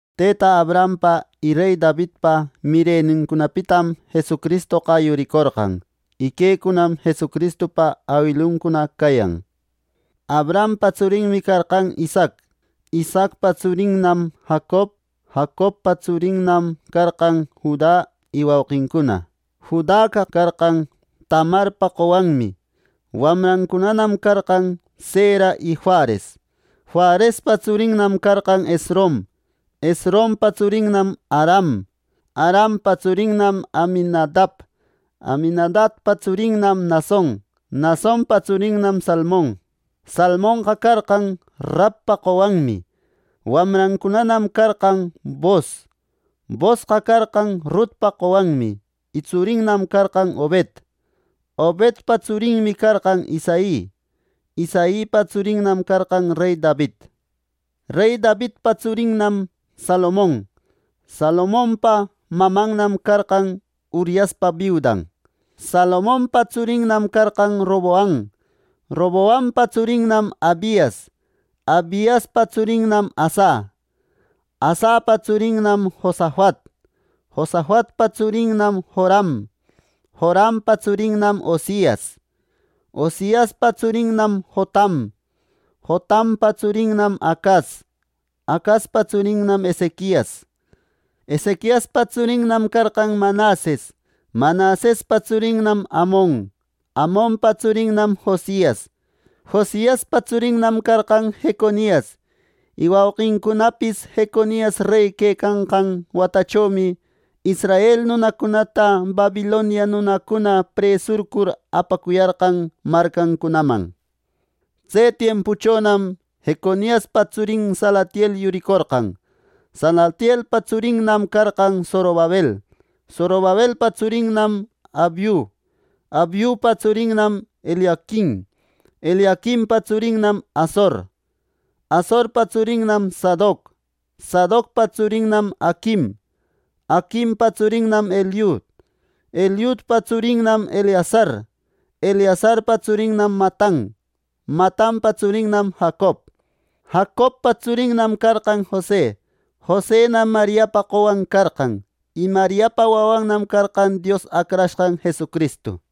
Tëta Abrahampa y rey Davidpa mirenincunapitam Jesucristoqa yuricorqan. Y quecunam Jesucristupa awiluncuna cayan: Abrahampa tsurinmi carqan Isaac; Isaacpa tsurinnam Jacob; Jacobpa tsurinnam carqan Juda y wauqincuna; Judaqa carqan Tamarpa qowanmi; wamrancunanam carqan Zera y Fares; Farespa tsurinnam carqan Esrom; Esrompa tsurinnam Aram; Arampa tsurinnam Aminadab; Aminadabpa tsurinnam Nason; Nasonpa tsurinnam Salmon; Salmonqa carqan Rabpa qowanmi; wamrancunanam carqan Boos; Boosqa carqan Rutpa qowanmi, y tsurinnam carqan Obed; Obedpa tsurinmi carqan Isai; Isaipa tsurinnam carqan rey David. Rey Davidpa tsurinnam Salomon; Salomonpa mamannam carqan Uriaspa biudan; Salomonpa tsurinnam carqan Roboam; Roboampa tsurinnam Abias; Abiaspa tsurinnam Asa; Asapa tsurinnam Josafat; Josafatpa tsurinnam Joram; Jorampa tsurinnam Ozias; Oziaspa tsurinnam Jotam; Jotampa tsurinnam Acas; Acaspa tsurinnam Ezequias; Ezequiaspa tsurinnam carqan Manases; Manasespa tsurinnam Amon; Amonpa tsurinnam Josias; Josiaspa tsurinnam carqan Jeconias y wauqincunapis; Jeconias rey quecanqan watachomi israel nunacunata Babilonia nunacuna presurcur apacuyarqan marcancunaman. Tse tiempuchonam Jeconiaspa tsurin Salatiel yuricorqan; Salatielpa tsurinnam carqan Zorobabel; Zorobabelpa tsurinnam Abiud; Abiudpa tsurinnam Eliaquim; Eliaquimpa tsurinnam Asor; Asorpa tsurinnam Sadoc; Sadocpa tsurinnam Aquim; Aquimpa tsurinnam Eliud; Eliudpa tsurinnam Eleasar; Eleasarpa tsurinnam Matan; Matanpa tsurinnam Jacob; Jacobpa tsurinnam carqan Jose; Josenam Mariapa qowan carqan; y Mariapa wawannam carqan Dios Acrashqan Jesucristu.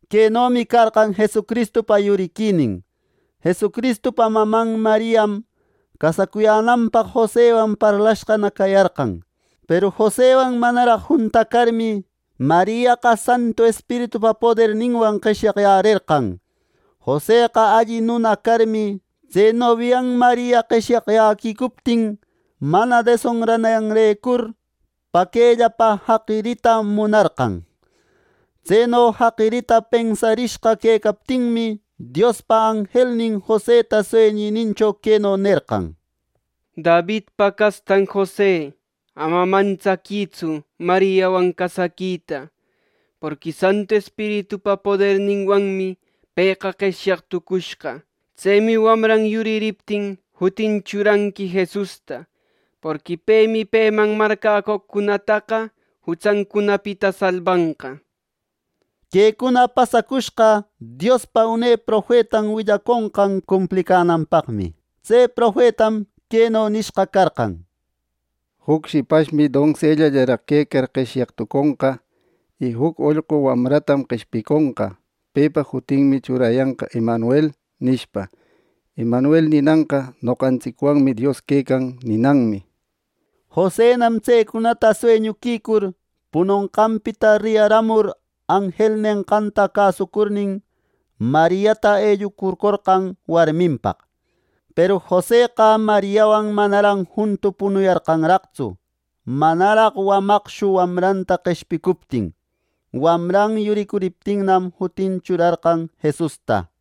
Quenomi carqan Jesucristupa yuriquinin: Jesucristupa maman Mariam, casacuyänanpaq Josewan parlayashqana cayarqan. Peru Josewan manaraq juntacarmi, Mariaqa Santu Espiritupa poderninwan qeshyaqyärerqan Joseqa alli nuna carmi, tse nobian Maria qeshyaqyäquicuptin, mana desonrananrecur paquellapa jaqirita munarqan. Tseno jaqiriquita pensarishqa quecaptinmi, Diospa anjelnin Joseta sueñinincho, queno nerqan: —Davidpa castan Jose, ama mantsaquïtsu Mariawan casaquita. Porqui Santu Espiritupa poderninwanmi pëqa qeshyaq tucushqa. Tsemi wamran yuririptin, jutin churanqui Jesusta. Porqui pemi peman marcäcoqcunataqa jutsancunapita salbanqa —nir. Quecuna pasacushqa Diospa une profetan willaconqan cumplicänanpaqmi. Tse profetam queno nishqa carqan: “Juc shipashmi donsellallaraq quecar qeshyaq tuconqa y juc ollqu wamratam qeshpiconqa. Pepa jutinmi churayanqa ‘Emanuel’” nishpa. (Emanuel ninanqa “Noqantsicwanmi Dios quecan” ninanmi.) Josenam tsecunata sueñuquicur punonqanpita riyaramur, anjel nenqanta cäsucurnin, Mariata ellucurcorqan warminpaq. Peru Joseqa Mariawan manaran juntu punuyarqanraqtsu, manaraq wamaqshu wamranta qeshpicuptin. Wamra yuricuriptinnam, jutin churarqan Jesusta.